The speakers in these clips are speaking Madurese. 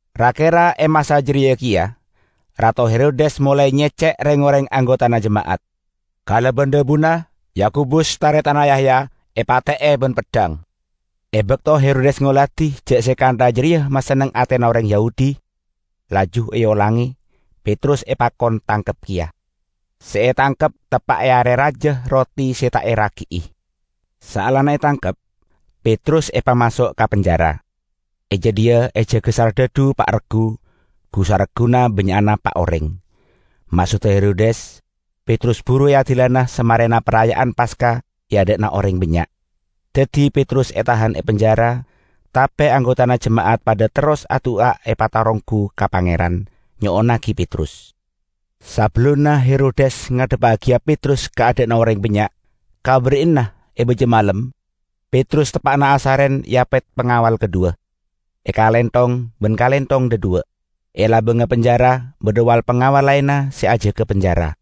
Ra-kera e masa jareya keya, Rato Herodes molae nyecce' reng-oreng anggotana jema'at. Kalaban dhabuna, Yakobus, taretanna Yahya epate'e ban peddhang. E bakto Herodes ngoladi ja' se kantha jareya masenneng atena oreng Yahudi, laju eolange; Petrus epakon tangkep keya. Se etangkep teppa' e Are Raja Roti Se Ta' Eragi'i. Saellana etangkep, Petrus epamaso' ka penjara. E jadhiya ejaga sardhadhu pa' reggu -- gu-saregguna bannya'na pa' oreng. Maksodda Herodes Petrus buru eadilana samarena Paraya'an Paska e adha'na oreng bannya'. Daddi Petrus etahan e penjara; tape anggotana jema'at padha terros adu'a epataronggu ka Pangeran, nyo'onnagi Petrus. Sabellunna Herodes ngadhebbagiya Petrus ka adha'na oreng bannya', ka ba'ari'anna e baja malem Petrus teppa'na asaren eapet pangawal kadhuwa, ekalenthong ban kalenthong dhadhuwa'. E labangnga penjara badha wal-pangawal laenna se ajaga penjara.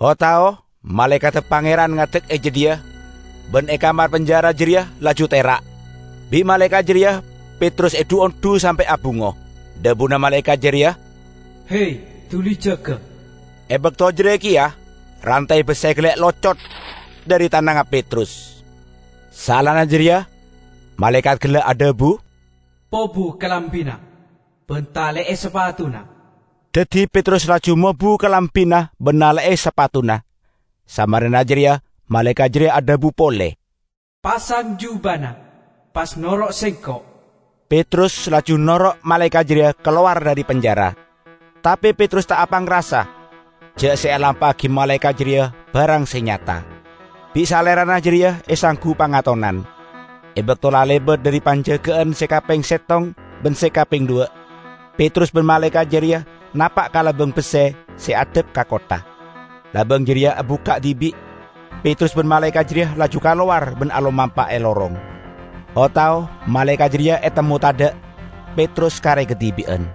O-tao malaekadda Pangeran ngadek e jadhiya, ban e kamar penjara jareya laju tera'. Bi' malaekat jareya Petrus edhu-ondhu sampe' abungo. Dhabuna malaekat jareya, "He! Duli jaga!" E bakto jareya keya rantay besse gella' locot dhari tanangnga Petrus. Saellana jareya malaekat gella' adhabu, "Pobu kalambina ban tale'e sapatuna." Daddi Petrus laju mobu kalambina ban nale'e sapatuna. Samarena jareya malaekat jareya adhabu pole, "Pasang jubana, pas noro' sengko'." Petrus laju noro' malaekat jareya kalowar dhari penjara. Tape Petrus ta' apangrasa ja' se elampa'agi malaekat jareya barang se nyata. Bi' salerana jareya esanggu pangatonan. E bakto la lebat dhari panjaga'an se kapeng settong ban se kapeng dhuwa', Petrus ban malaekat jareya napa' ka labang besse se addhep ka kottha. Labang jareya abukka' dibi', Petrus ban malaekat jareya laju kalowar ban alomampa e lorong. O-tao malaekat jareya etemmo tadha', Petrus kare kadibi'an.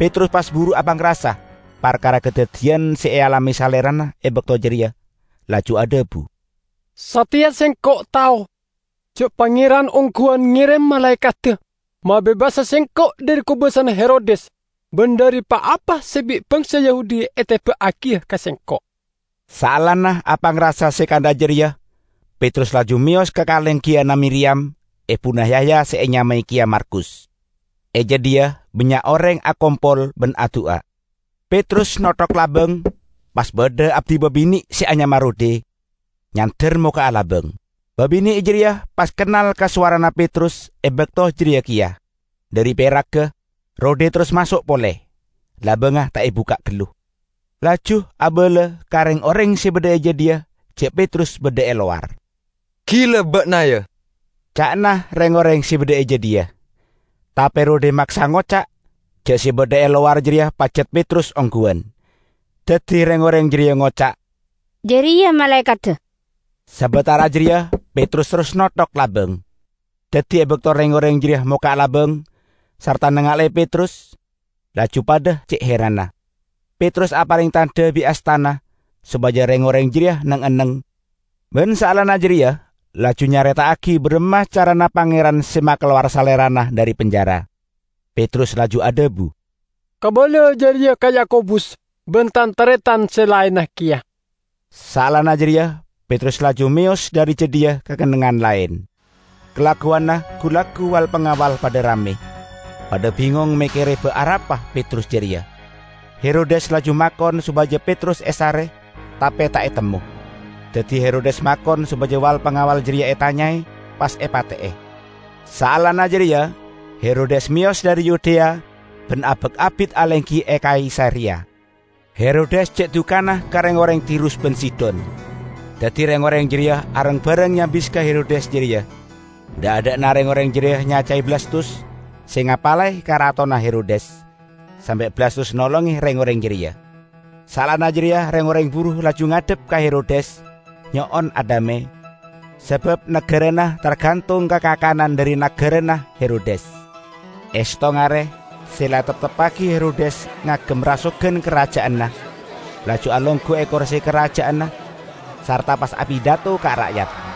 Petrus pas buru apangrasa parkara kadaddiyan se ealame salerana e bakto jareya, laju adhabu, "Sateya sengko' tao ja' Pangeran ongguwan ngerem malaekadda mabebasa sengko' dhari kobasana Herodes ban dhari pa-apa se bi' bangsa Yahudi eteba'agiya ka sengko'." Saellana apangrasa se kantha jareya, Petrus laju meyos ka kalenggiyanna Miriyam, ebuna Yahya se enyamae keya Markus. E jadhiya bannya' oreng akompol ban adu'a. Petrus nokthok labang, pas badha abdi babine' se anyama Rode, nyander mokka'a labang. Babine' jareya pas kennal ka sowarana Petrus e bakto jareya keya. Dhari peragga, Rode terros maso' pole, labangnga ta' ebukka' gallu, laju abala ka reng-oreng se badha e jadhiya ja' Petrus badha e lowar. "Gila ba'na, ya!" ca'na reng-oreng se badha e jadhiya. Tape Rode maksa ngoca' ja' se badha e lowar jareya pajat Petrus ongguwan. Daddi reng-oreng jareya ngoca', "Jareya malaekadda!" Sabatara jareya Petrus terros nokthok labang. Daddi e bakto reng-oreng jareya mokka' labang, sarta nangale'e Petrus, laju padha ce' heranna. Petrus apareng tandha bi' astana sopaja reng-oreng jareya neng-enneng, ban saellana jareya laju nyareta'agi baramma carana Pangeran se makalowar salerana dhari penjara. Petrus laju adhabu, "Kabala jareya ka Yakobus ban tan-taretan se laenna keya." Saellana jareya Petrus laju meyos dhari jadhiya ka kennengngan laen. Kalagguwanna gu-laggu wal-pangawal padha ramme. Padha bingong mekkere ba' arapa Petrus jareya. Herodes laju makon sopaja Petrus esare, tape ta' etemmo. Daddi Herodes makon sopaja wal-pangawal jareya etanyae, pas epate'e. Saellana jareya Herodes meyos dhari Yudea ban abak abit alenggi e Kaisareya. Herodes ce' dukana ka reng-oreng Tirus ban Sidon. Daddi reng-oreng jareya areng-bareng nyabis ka Herodes jareya. Dha'-adha'na reng-oreng jareya nyacae Blastus, se ngapalae karatonna Herodes, sampe' Blastus nolonge reng-oreng jareya. Saellana jareya reng-oreng buru laju ngadhep ka Herodes, nyo'on adhame, sabab nagarana targantong ka kakanan dhari nagarana Herodes. E settong are se la etepteppagi Herodes ngagem rasogan karaja'anna, laju alonggu e korse karaja'anna sarta pas apidato ka ra'yat.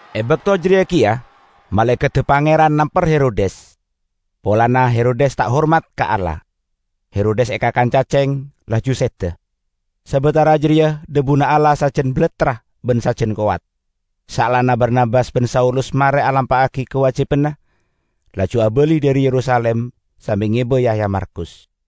E bakto jareya keya malaekadda Pangeran namper Herodes, polana Herodes ta' hormat ka Allah. Herodes ekakan caceng, laju seda. Sabatara jareya dhabuna Allah sajan balattra ban sajan kowat. Saellana Barnabas ban Saulus mare alampa'agi kawajibanna, laju abali dhari Yerusalim sambi ngeba Yahya Markus.